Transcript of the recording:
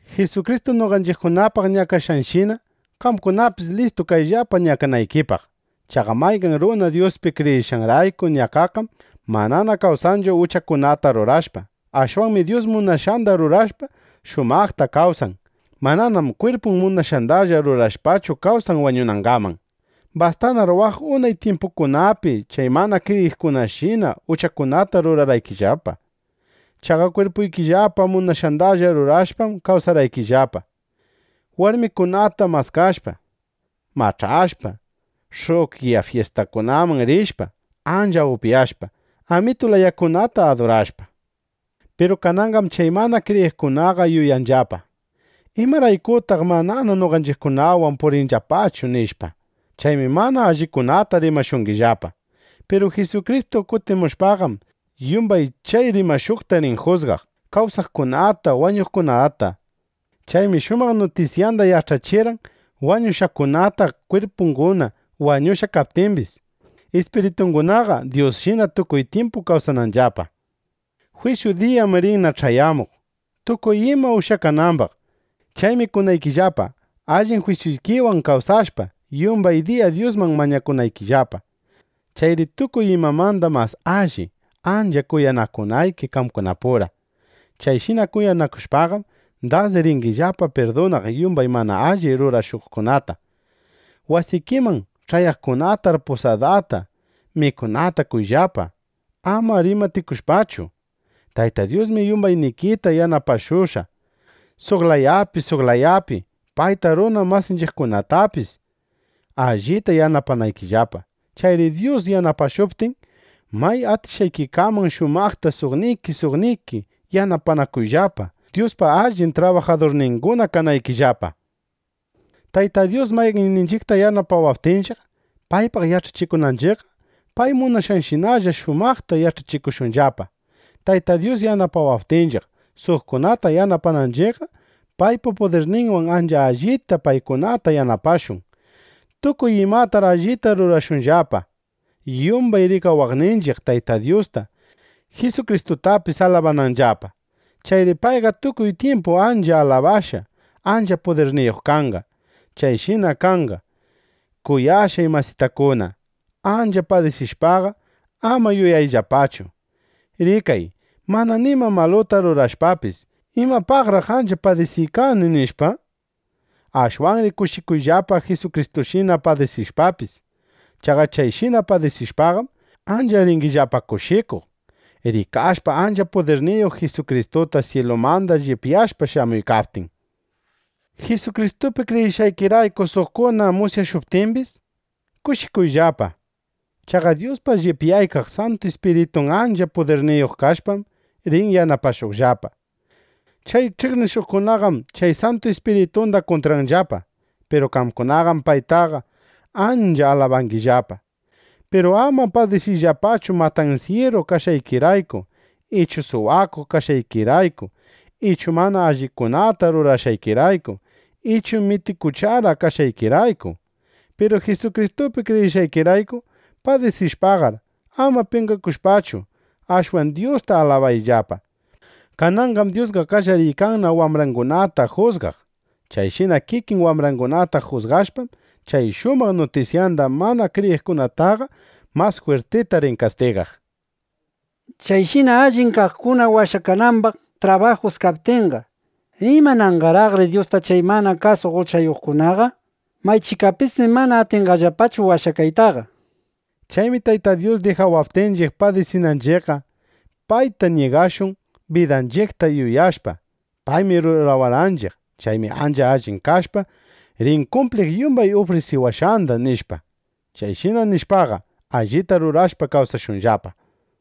Jisukristu noqanchiqpaq ñakashqanshina, qamkunapis listu kayllapa ñakanaykipaq. Chaqa mayqan runa Dyuspi kriyishqanrayku ñakaqqam manana kawsanchu uchakunata rurashpa. Ashwanmi Dyus munashqanda rurashpa, shumaqta kawsan. Mananam kwirpun munashqandalla rurashpachu kawsan wañunangaman. Bastanar waq unay tyimpukunapi chay mana kriyiqkunashina uchakunata rurarqaykillapa. Chaqa kwirpuykillapa munashqandalla rurashpam kawsarqaykillapa, warmikunata maskashpa, mach'ashpa, sh'uqyana fyistakunaman rishpa, ancha upyashpa, amitu layakunata adurashpa. Piru kananqam chay mana kriyiqkunaqa yuyanllapa: ¿Imaraykutaq manana noqanchiqkunawan purinllapachu? nishpa. Chaymi mana allikunata rimashungillapa. Piru Jisukristu kutimushpaqam, yumbay chay rimashuqta rin jusgaq, kawsaqkunata, wañushqakunata. Chaymi shumaq nutisyanda yach'achirqan wañushqakunata, kwirpunguna wañushqa kaptimbis, ispiritungunaqa Dyusshina tukuy tyimpu kawsananllapa. Jwisyu diyam rinna ch'ayamuq, tukuy ima ushyakanambaq. Chaymi kunaykillapa, allin jwisyuykiwan kawsashpa, yumbay diya Dyusman mañakunaykillapa. Chayri tukuy imamanda mas alli, ancha kuyanakunayki qamkunapura. Chayshina kuyanakushpaqam, das ringillapa pirdunaq yumbay mana alli rurashuqkunata. Wasikiman ch'ayaqkunatar pusadata, mikunata qoyllapa, ama rimatikushpachu. Tayta Dyusmi yumbaynikita yanapashushqa, suq layapi, suq layapi payta, runa masinchiqkunatapis allita yanapanaykillapa. Chayri Dyus yanapashuptin, may atishqaykikaman shumaqta suqniki suqniki yanapanakuyllapa, Dyuspa allin trabajadurninguna kanaykillapa. Tayta Dyus mayqanninchiqta yanapawaptinchiq, paypaq yach'achikunanchiqqa, pay munashqanshinalla shumaqta yach'achikushunllapa. Tayta Dyus yanapawaptinchiq, suqkunata yanapananchiqqa, paypa pudirninwan ancha allita paykunata yanapashun. Tukuy imatar allita rurashunllapa, yumbay rikawaqninchiq Tayta Dyusta, Jisukristutapis alabananllapa. Chayri payqa tukuy tyimpu ancha alabashqa, ancha pudirniyuq kanqa. Chayshina kanqa. Kuyashqay masitakuna, ancha padisishpaqa, ama yuyayllapachu: ¡Rikay! Mana nima maluta rurashpapis, ¿imapaqraq ancha padisiykani? nishpa. Ashwanri kushikuyllapa Jisukristushina padisishpapis. Chaqa chayshina padisishpaqam, ancha ringillapa kushikuq, rikashpa ancha pudirniyuq Jisukristuta syilumanda llipyashpa shamuykaptin. Jisukristupi kriyishqaykirayku suqkuna musyashuptimbis, kushikuyllapa. Chaqa Dyuspa llipyaykaq Santu Ispiritun ancha pudirniyuq kashpam, rin yanapashuqllapa. ˻Chay ch'iqnishuqkunaqam chay Santu Ispiritunda kuntranllapa. Piru qamkunaqam paytaqa ancha alabangillapa.˼ Piru ama padisiyllapachu matansyiru kashqaykirayku ichu suwakuq kashqaykirayku ichu mana allikunata rurashqaykirayku ichu mitikuchara kashqaykirayku. Piru Jisukristupi kriyishqaykirayku padisishpaqar, ama penqakushpachu, ashwan Dyusta alabayllapa. Kananqam Dyusqa qallariykanna wambrangunata jusgaq. Chayshina kikin wambrangunata jusgashpaqam, chay shumaq nutisyanda mana kriyiqkunataqa mas jwirtita rin kastigaq. Chayshina allin kaqkuna washakanambaq trabajus kaptinqa, ¿imananqaraqri Dyusta chay mana kasuq uchayuqkunaqa? (Maychikapismi mana atinqallapachu washakaytaqa.) Chaymi Tayta Dyus dijawaptinchiq padisinanchiqqa, payta mingashun bidanchiqta yuyashpa: Paymi rurawarqanchiq. Chaymi ancha allin kashpa, rin kumpliq yumbay ufrisiwashqanda, nishpa. Chayshina mingashpaqa, allita rurashpa kawsashunllapa.